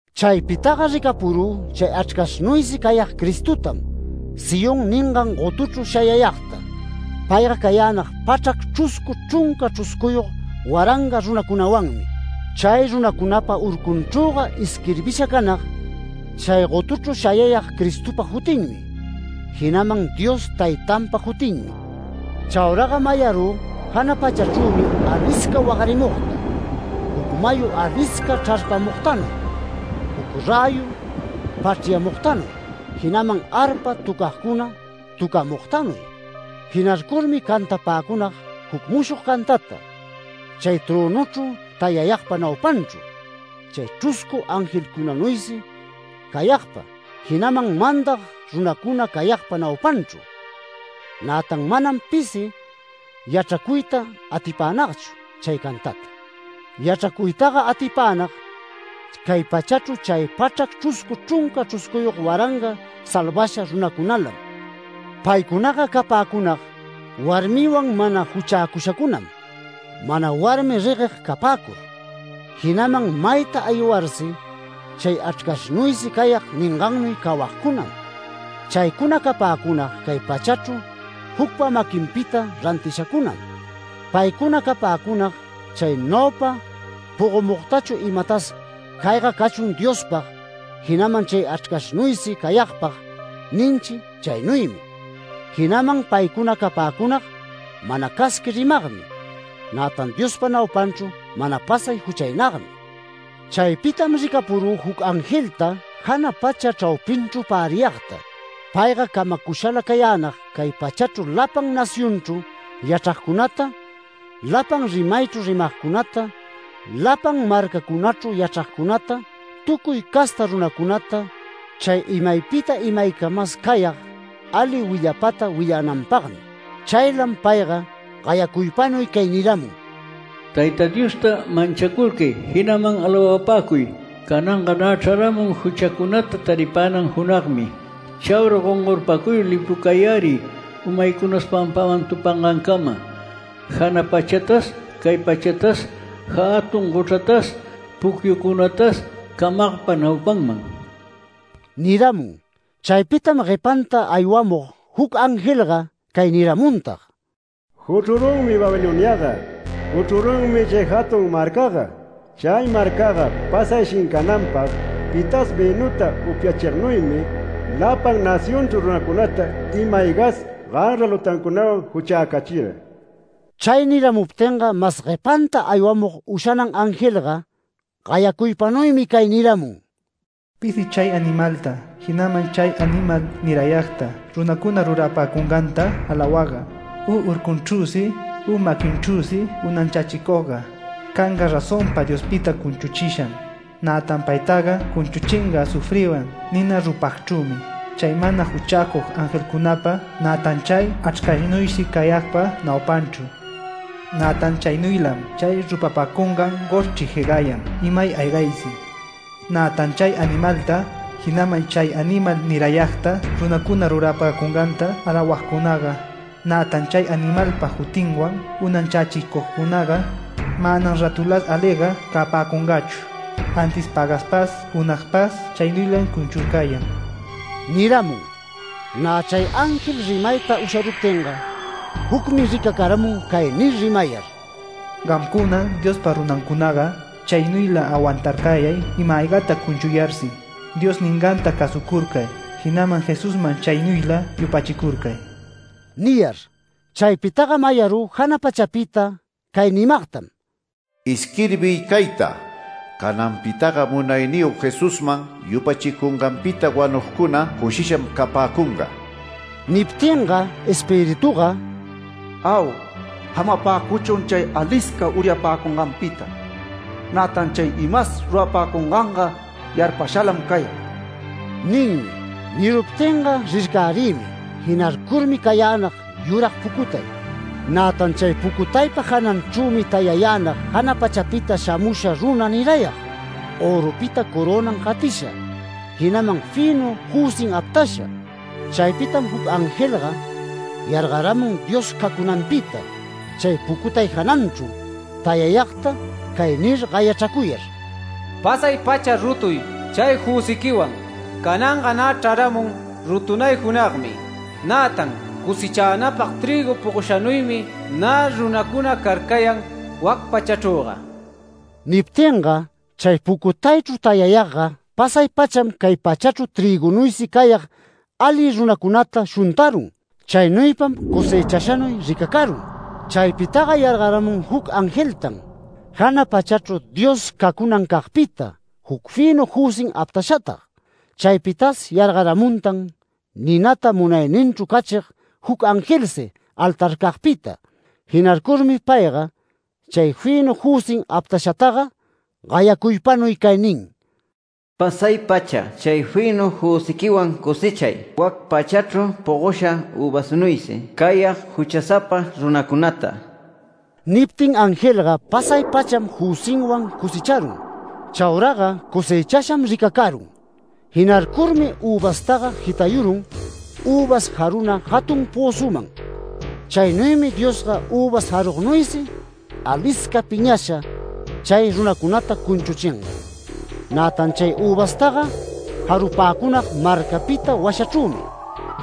Chaypitaga ricapurü chay Achrcashnuysi cayag Cristotam Sión ningan gotuchru shayayagta. Payga cayänag pachrac chruscu chrunca chruscuyog waranga runacunawanmi. Chay runacunapa urcunchrüga isquirbisha canag chay gotuchru shayayag Cristopa jutinmi, jinaman Dios Taytanpa jutinmi. Chauraga mayarü jana pachachrümi alisca wagarimugta, juc mayu alisca chrarpamugtanuy, juc räyu pachryamugtanuy, jinaman arpa töcagcuna töcamugtanuy. Jinarcurmi cantapäcunag juc mushog cantata, chay trönuchru tayayagpa naupanchru, chay chruscu angelcunanuysi cayagpa, jinaman mandag runacuna cayagpa naupanchru. Nätan manam pisi yachracuyta atipänagchu chay cantata. Yachracuytaga atipänag cay pachachru chay pachrac chruscu chrunca chruscuyog waranga salvasha runalancunam. Paycunaga capäcunag warmiwan mana juchäcushacunam, mana warmi regueg capäcur. Jinaman mayta aywarsi chay Achrcashnuysi cayag ningannuy cawagcunam. Chaycuna capäcunag cay pachrachru jucpa maquinpita rantishancunam. Paycuna capäcunag, chay naupa pogomugtachu imatas “Cayga cachun Diospag, jinaman chay Achrcashnuysi cayagpag” ninchi, chaynuymi. Jinaman paycuna capäcunag mana casqui rimagmi, nätan Diospa naupanchru mana pasay juchaynagmi. Chaypitam ricapurü juc angelta jana pacha chraupinchru päriyagta. Payga camacushala cayänag cay pachachru lapan nacionchru yachragcunata, lapan rimaychru rimagcunata, lapan marcacunachru yachragcunata, tucuy casta runacunata, chay imaypita imaycamas cayag ali willapata willananpagmi. Chaylam payga gayacuypanuy cay niramun: “Tayta Diosta manchacurcay, jinaman alawapäcuy. Cananga nä chararamun juchacunata taripänan junagmi. Chaura gongorpacuyur lipucayäriy, umaycunas pampaman tupangancama, jana pachatas, cay pachatas, jatun gochratas, pucyucunatas camagpa naupanman” niramun. Chaypitam guepanta aywamug juc angelga cay niramuntag: “¡Juchrurunmi Babiloniaga! ¡Juchrurunmi chay jatun marcaga! Chay marcaga pasay shincananpag pitas vïnuta upyachignuymi, lapan nacionchru runacunata ima-aygas ganra lutancunawan juchäcachira”. Chay niramuptinga mas guepanta aywamug ushanan angelga gayacuypanuymi cay niramun: “Pisi chay animalta, jinaman chay animal nirayagta runacuna rurapäcunganta alawagga, u urcunchrüsi u maquinchrüsi unanchächicugga, canga razonpa Diospita cunchuchisham. Nätan paytaga cunchuchinga azufriwan nina rupagchrümi, chay mana juchäcug angelcunapa, nätan chay Achrcashnuysi cayagpa naupanchru. Nätan chaynuylam chay rupapäcungan goshchri jegayan imay aygaysi, nätan chay animalta, jinaman chay animal nirayagta runacuna rurapäcunganta alawagcunaga, nätan chay animalpa jutinwan unanchächicugcunaga, manam rätulas aliga capäcungachu. Antis pagaspas junagpas chaynuylam cunchurcayan” niramun. Nä chay ángel rimayta usharuptinga jucmi ricacaramun, cay nir rimayar: “Gamcuna, Diospa runancunaga, chaynuyla awantarcayay ima-aygata cunchuyarsi, Dios ninganta cäsucurcay, jinaman Jesusman chaynuyla yupachicurcay” niyar. Chaypitaga mayarü jana pachapita cay nimagtam: “Isquirbiy cayta: Cananpitaga Munayniyog Jesusman yupachicunganpita wanugcuna cushisham capäcunga”. Niptinga Espirituga “Au, jamapäcuchun chay alisca uryapäcunganpita. Nätan chay imas rurapäcunganga yarpashalam cayan” ninmi. Niruptinga rircärïmi, jinarcurmi cayänag yurag pucutay. Nätan chay pucutaypa jananchrümi tayayänag jana pachapita shamusha runa nirayag, örupita corönan jatisha, jinaman fïnu jüsin aptasha. Chaypitam juc angelga yargaramun Dios cacunancagpita chay pucutay jananchru tayayagta cay nir gayachracuyar: “Pasay-pacha rutuy chay jüsiquiwan. Cananga nä chraramun rutunay junagmi. Nätan cosechanapag trïgu pogoshanuymi nä runacuna carcayan wac pachachrüga”. Niptinga chay pucutaychru tayayagga pasay-pacham cay pachachru trïgunuysi cayag ali runacunata shuntarun. Chaynuypam cosechashanuy ricacarun. Chaypitaga yargaramun juc angeltan, jana pachachru Dios cacunancagpita juc fïnu jüsim aptashatag. Chaypitas yargaramuntan ninata munayninchru cachig juc angelsi altarcagpita. Jinarcurmi payga chay fïnu jüsin aptashataga gayacuypanuy cay nin: “Pasay-pacha chay fïnu jüsiquiwan cosechay wac pachachru pogosha üvasnuysi cayag juchasapa runacunata”. Niptin angelga pasay-pacham jüsinwan cosecharun. Chauraga cosechasham ricacarun. Jinarcurmi üvastaga jitayurun, üvas jaruna jatun pözuman. Chaynuymi Diosga üvas jarugnuysi alisca piñasha chay runacunata cunchuchinga. Nätan chay üvastaga jarupäcunag marcapita washachrümi.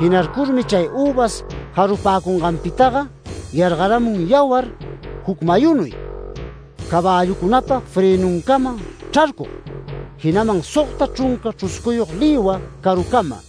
Jinarcurmi chay üvas jarupäcunganpitaga yargaramun yawar juc mayunuy, caballucunapa frënuncama chrarcug, jinaman sogta chrunca chruscuyog lïwa carucama.